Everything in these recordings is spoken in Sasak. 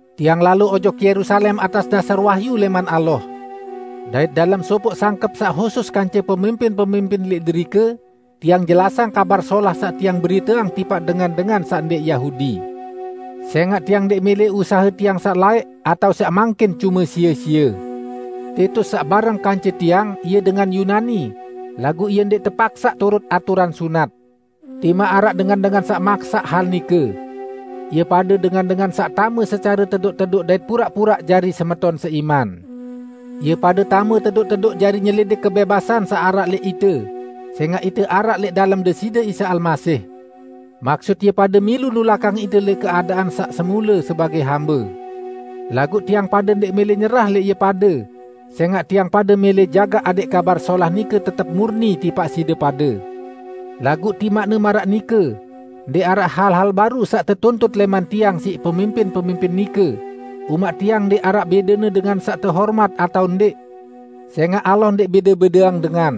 Tiang lalo ojok Yerusalem atas dasar wahyu lẽman Allah. Dait dalem sopoq sangkep saq husus kance pemimpin-pemimpin lẽq derike, tiang jelasang Kabar Solah saq tiang beriteang tipaq dengan-dengan saq ndẽq Yahudi. Sẽngaq tiang ndẽq mẽlẽ usahe tiang saq laẽq, atao saq mangkin, cume sie-sie. Titus, saq bareng kance tiang, ie dengan Yunani, laguq ie ndẽq tepaksaq turut aturan sunat, timaq araq dengan-dengan saq maksaq hal nike. Ie pade dengan-dengan saq tame secare tedoq-tedoq dait puraq-puraq jari semeton seiman. Ie pade tame tedoq-tedoq jari nyelidik kebẽbasan saq araq lẽq ite, sẽngaq ite araq lẽq dalem Deside Isa Almasih. Maksut ie pade milu nulakang ite lẽq keadaan saq semule sebagẽ hambe, laguq tiang pade ndẽq mẽlẽ nyerah lẽq ie pade, sẽngaq tiang pade mẽlẽ jagaq adẽq Kabar Solah nike tetep murni tipaq side pade. Laguq timaqne maraq nike, ndẽq araq hal-hal baru saq tetuntut lẽman tiang siq pemimpin-pemimpin nike -- umaq tiang ndẽq araq bẽdene dengan saq tehormat atao ndẽq, sẽngaq Allah ndẽq bẽde-bẽdeang dengan.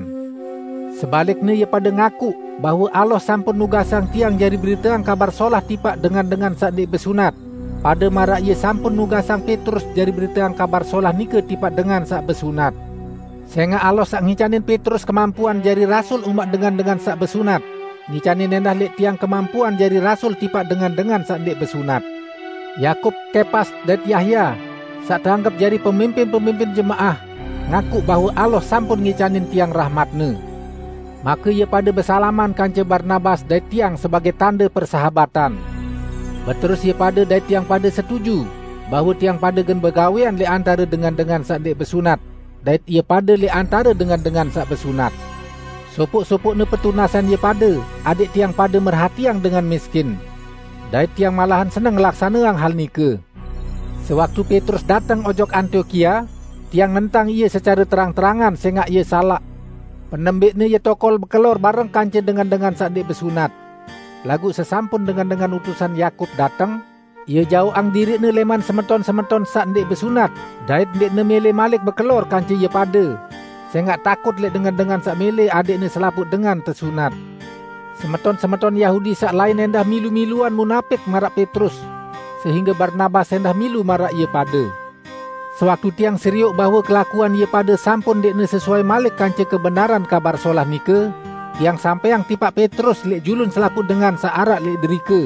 Sebalikne, ie pade ngakuq bahwe Allah sampun nugasang tiang jari beriteang Kabar Solah tipaq dengan-dengan saq ndẽq besunat, pade maraq Ie sampun nugasang Petrus jari beriteang Kabar Solah nike tipaq dengan saq besunat. Sẽngaq Allah saq ngicanin Petrus kemampuan jari rasul umaq dengan-dengan saq besunat, ngicanin ẽndah lẽq tiang kemampuan jari rasul tipaq dengan-dengan saq ndẽq besunat. Yakub, Kepas dait Yahya, saq teanggep jari pemimpin-pemimpin jemaah, ngakuq bahwe Allah sampun ngicanin tiang rahmat-Ne. Make ie pade besalaman kance Barnabas dait tiang sebagẽ tande persahabatan. Beterus ie pade dait tiang pade setuju bahwe tiang pade gen begawẽan lẽq antare dengan-dengan saq ndẽq besunat, dait ie pade lẽq antare dengan-dengan saq besunat. Sopoq-sopoqne petunasan ie pade adẽq tiang pade merhatiang dengan miskin. Dait tiang malahan seneng ngelaksaneang hal nike. Sewaktu Petrus dateng ojok Antiokia, tiang nentang ie secare terang-terangan, sẽngaq ie salaq. Penembẽqne ie tokol bekelor bareng kance dengan-dengan saq ndẽq besunat. Laguq sesampun dengan-dengan utusan Yakub dateng, ie jaoqang diriqne lẽman semeton-semeton saq ndẽq besunat dait ndẽqne mẽlẽ malik bekelor kance ie pade, sẽngaq takut lẽq dengan-dengan saq mẽlẽ adẽqne selapuq dengan tesunat. Semeton-semeton Yahudi saq lain ẽndah milu-miluan munapik maraq Petrus, sehingge Barnabas ẽndah milu maraq ie pade. Sewaktu tiang serioq bahwe kelakuan ie pade sampun ndẽqne sesuai malik kance kebenaran Kabar Solah nike, tiang sampẽang tipaq Petrus lẽq julun selapuq dengan saq araq lẽq derike,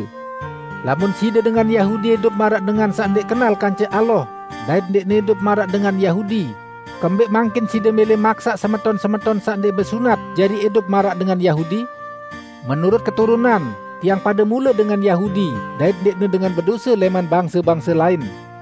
"Lamun side dengan Yahudi idup maraq dengan saq ndẽq kenal kance Allah dait ndẽqne idup maraq dengan Yahudi, kembẽq mangkin side mẽlẽ maksaq semeton-semeton saq ndẽq besunat jari idup maraq dengan Yahudi?" Menurut keturunan, tiang pade mule dengan Yahudi dait ndẽqne "dengan bedose lẽman bangse-bangse lain".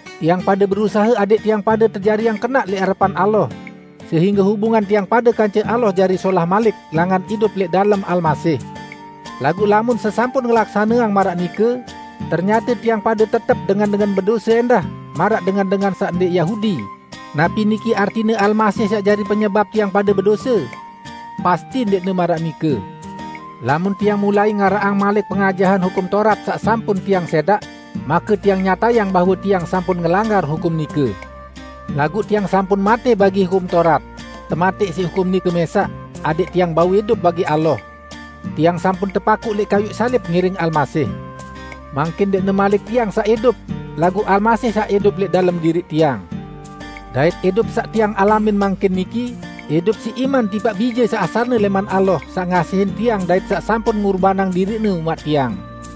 Tiang pade berusahe adẽq tiang pade tejariang kenaq lẽq arepan Allah sehingge hubungan tiang pade kance Allah jari solah malik langan idup lẽq dalem Almasih. Laguq lamun sesampun ngelaksaneang maraq nike, ternyate tiang pade tetep "dengan-dengan bedose" ẽndah maraq dengan-dengan saq ndẽq Yahudi, napi niki artine Almasih saq jari penyebap tiang pade bedose? Pasti ndẽqne maraq nike! Lamun tiang mulai ngaraqang malik pengajahan Hukum Taurat saq sampun tiang sẽdaq, make tiang nyatayang bahwe tiang sampun ngelanggar hukum nike. Laguq tiang sampun matẽ bagi Hukum Taurat -- tematẽq siq hukum nike mẽsaq -- adẽq tiang bau idup bagi Allah. Tiang sampun tepakuq lẽq kayuq salib ngiring Almasih. Mangkin ndẽqne malik tiang saq idup, laguq Almasih saq idup lẽq dalem diriq tiang. Dait idup saq tiang alamin mangkin niki, idup siq iman tipaq Bije saq asalne lẽman Allah saq ngasihin tiang dait saq sampun ngurbanang diriq-Ne umaq tiang.